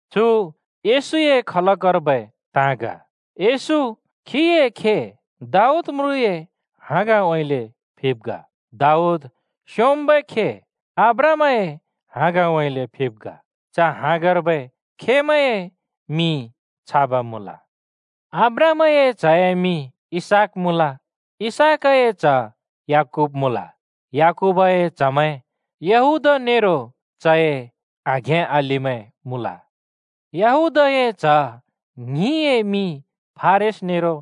चु येशूए खलकर्बै ताँ ग। येशू खीए खे, दाऊद म्रुँए हाँगउँइँले फिब् ग। दाऊद स्‍योंम्‍बै खे अब्राहामए हाँगउँइँले फिब् ग। च हाँगर्बै खेमैंए मिं छाब् मुँल: अब्राहामए च्‍हए मिं इसहाक मुँल। इसहाकए च्‍ह याकूब मुँल। याकूबए च्‍हमैं यहूदा नेरो चए आघें-अलिमैं मुँल। यहूदाए च्‍ह ङ्हिंए मिं फारेस नेरो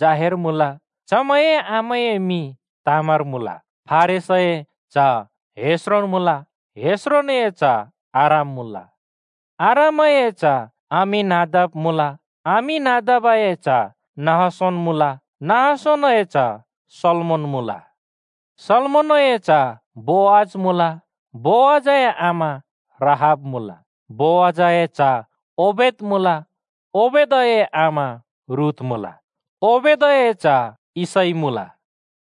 जाहेर मुँल। (चमैंए आमाए मिं तामार मुँल।) फारेसए च्‍ह हेस्रोन मुँल। हेस्रोनए च्‍ह आराम मुँल। आरामए च्‍ह अम्‍मीनादाब मुँल। अम्‍मीनादाबए च्‍ह नहशोन मुँल। नहशोनए च्‍ह सल्‍मोन मुँल। सल्मोनए च्ह बोअज मुँल। बोअजए आमा राहाब मुँल। बोअजए च्‍ह ओबेद मुँल। (ओबेदए आमा रूथ मुँल।) ओबेदए च्‍ह यिशै मुँल।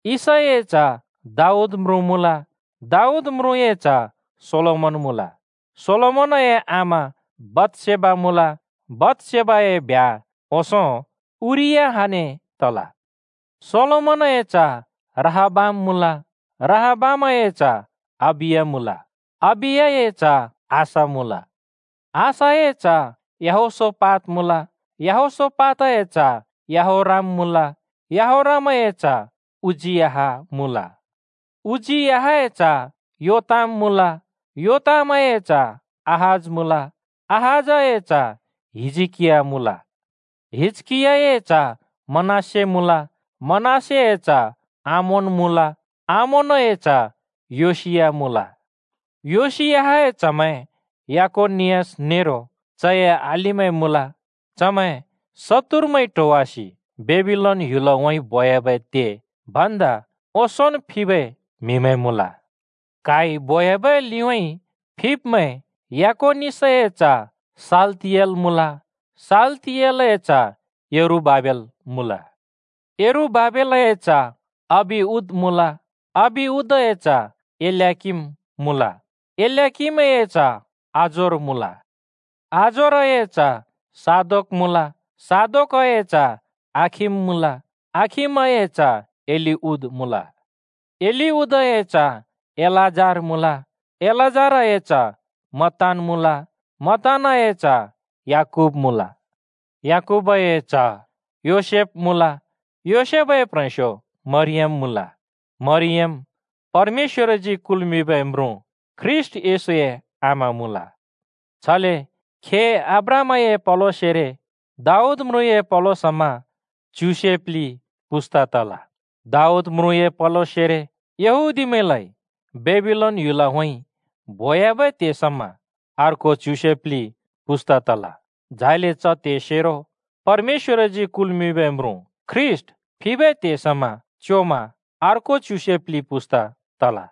यिशैए च्‍ह दाऊद म्रुँ मुँल। दाऊद म्रुँए च्‍ह सोलोमन मुँल। सोलोमनए आमा बतसेबा मुँल। बतसेबाए ब्ह्‍या ओंसों उरियाहने तल। सोलोमनए च्‍ह रहबाम मुँल। रहबामए च्‍ह अबिया मुँल। अबियाए च्‍ह आसा मुँल। आसाए च्‍ह यहोशापात मुँल। यहोशापातए च्‍ह यहोराम मुँल। यहोरामए च्‍ह उज्‍जियाह मुँल। उज्‍जियाहए च्‍ह योताम मुँल। योतामए च्‍ह आहाज मुँल। आहाजए च्‍ह हिजकिया मुँल। हिजकियाए च्‍ह मनश्‍शे मुँल। मनश्‍शेए च्‍ह आमोन मुँल। आमोनए च्‍ह योसिया मुँल। योशियाहए च्‍हमैं यकोनियास नेरो चए अलिमैं मुँल। चमैं शत्तुरमैंइ ट्होवासि बेबिलोन ह्‍युलउँइँ बोयाबै त्हे भन्दा ओंसोंन् फिबै म्हिमैं मुँल। क्हाइ बोयाबै लिउँइँ फिब्मैं यकोनियासए च्‍ह शालतिएल मुँल। शालतिएलए च्‍ह यरुबाबेल मुँल। यरुबाबेलए च्‍ह अबिउद मुँल। अबिउदए च्‍ह एल्‍याकीम मुँल। एल्‍याकीमए च्‍ह आजोर मुँल। आजोरए च्‍ह सादोक मुँल। सादोकए च्‍ह आखिम मुँल। आखिमए च्‍ह एलिउद मुँल। एलिउदए च्‍ह एलाजार मुँल। एलाजारए च्‍ह मत्तान मुँल। मत्तानए च्‍ह याकूब मुँल। याकूबए च्‍ह योसेफ मुँल। योसेफए प्ह्रेंस्यो मरियम मुँल। मरियम परमेश्‍वरजी कुल्मिंबै म्रुँ ख्रीष्‍ट येशूए आमा मुँल। छले खे अब्राहामए पलोसेरो दाऊद म्रुँए पलो समा च्युसे प्लि पुस्‍ता तल। दाऊद म्रुँए पलोसेरो यहूदीमैंलाइ बेबिलोन ह्‍युलउँइँ बोयाबै त्हे समा अर्को च्युसे प्लि पुस्‍ता तल। झाइले च त्हेसेरो परमेश्‍वरजी कुलबै म्रुँ ख्रीष्‍ट फिबै त्हे समा च्‍योमा अर्को च्युसे प्लि पुस्‍ता तल।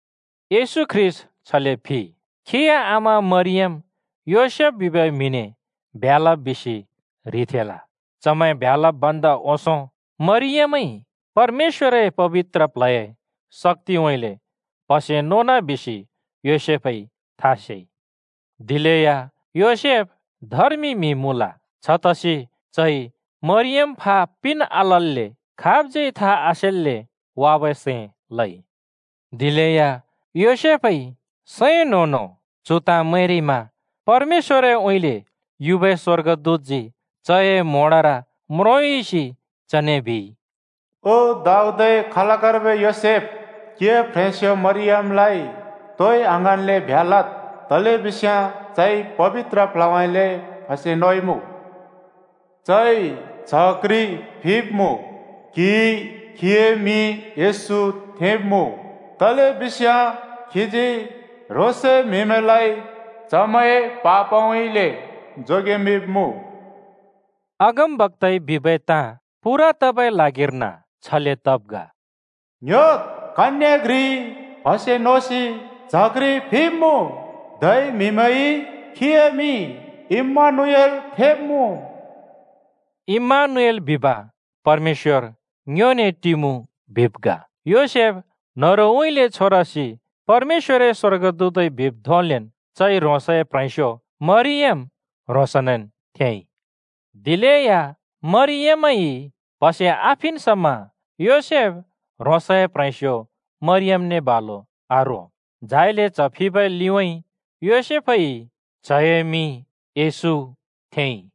येशू ख्रीष्‍ट छले फिइ। खीए आमा मरियम योसेफ बिबै म्हिने ब्ह्‍या लब् बिसि ह्रिथेंल। चमैं ब्ह्‍या लब् भन्दा ओंसों मरियमइ परमेश्‍वरए पबित्र प्ल्हए शक्‍तिउँइँले प्‍हसे नोन बिसि योसेफइ था सेइ। दिलेया योसेफ धर्मि म्‍हि मुँल। छतसि चइ मरियम फा पिन् आलल्‍ले खाबज्यै था आसेन्‍ले वाबै सैं लइ। दिलेया योसेफइ सैं न्‍हों-न्हों चु ताँ मैंरिमा परमेश्‍वरउँइँले युबै स्‍वर्गदूतजी चए म्‍होंडर म्रोंयुसि चने बिइ, “ओ दाऊदए खलकर्बै योसेफ, क्हिए प्ह्रेंस्यो मरियमलाइ तोइ आङ्हाँन्‍ले ब्ह्‍या लद्। तलेबिस्याँ चइ पबित्र प्ल्हउँइँले प्‍हसे नोइमुँ। चइ च्‍ह घ्रि फिब्‍मुँ। क्हिइ खीए मिं येशू थेंब्मुँ। तलेबिस्याँ खीजी ह्रोंसए म्‍हिमैंलाइ चमैंए पापउँइँले जोगेमिंब्‍मुँ।” अगमबक्‍ताइ बिबै ताँ पूरा तबै ल्हागिर्न छले तब् ग: “ङ्ह्‍योद्! कन्ये घ्रिइ प्हसे नोसि च्ह घ्रि फिब्मुँ। धै म्हिमैंइ खीए मिं इम्मानुएल थेंब्मुँ” इम्मानुएल बिब परमेश्‍वर ङ्योने टिमुँ बिब् ग। योसेफ न्हरुउँइँले छोरसि परमेश्‍वरए स्‍वर्गदूतइ बिब् धोंलेन् चइ ह्रोंसए प्ह्रेंस्यो मरियम ह्रोंसनेन् थेंइ। दिलेया मरियमइ प्हसे आफिन् समा योसेफ ह्रोंसए प्‍ह्रेंस्‍यो मरियमने बालु आरो। झाइले च्‍ह फिबै लिउँइँ योसेफइ च्हए मिं “येशू” थेंइ।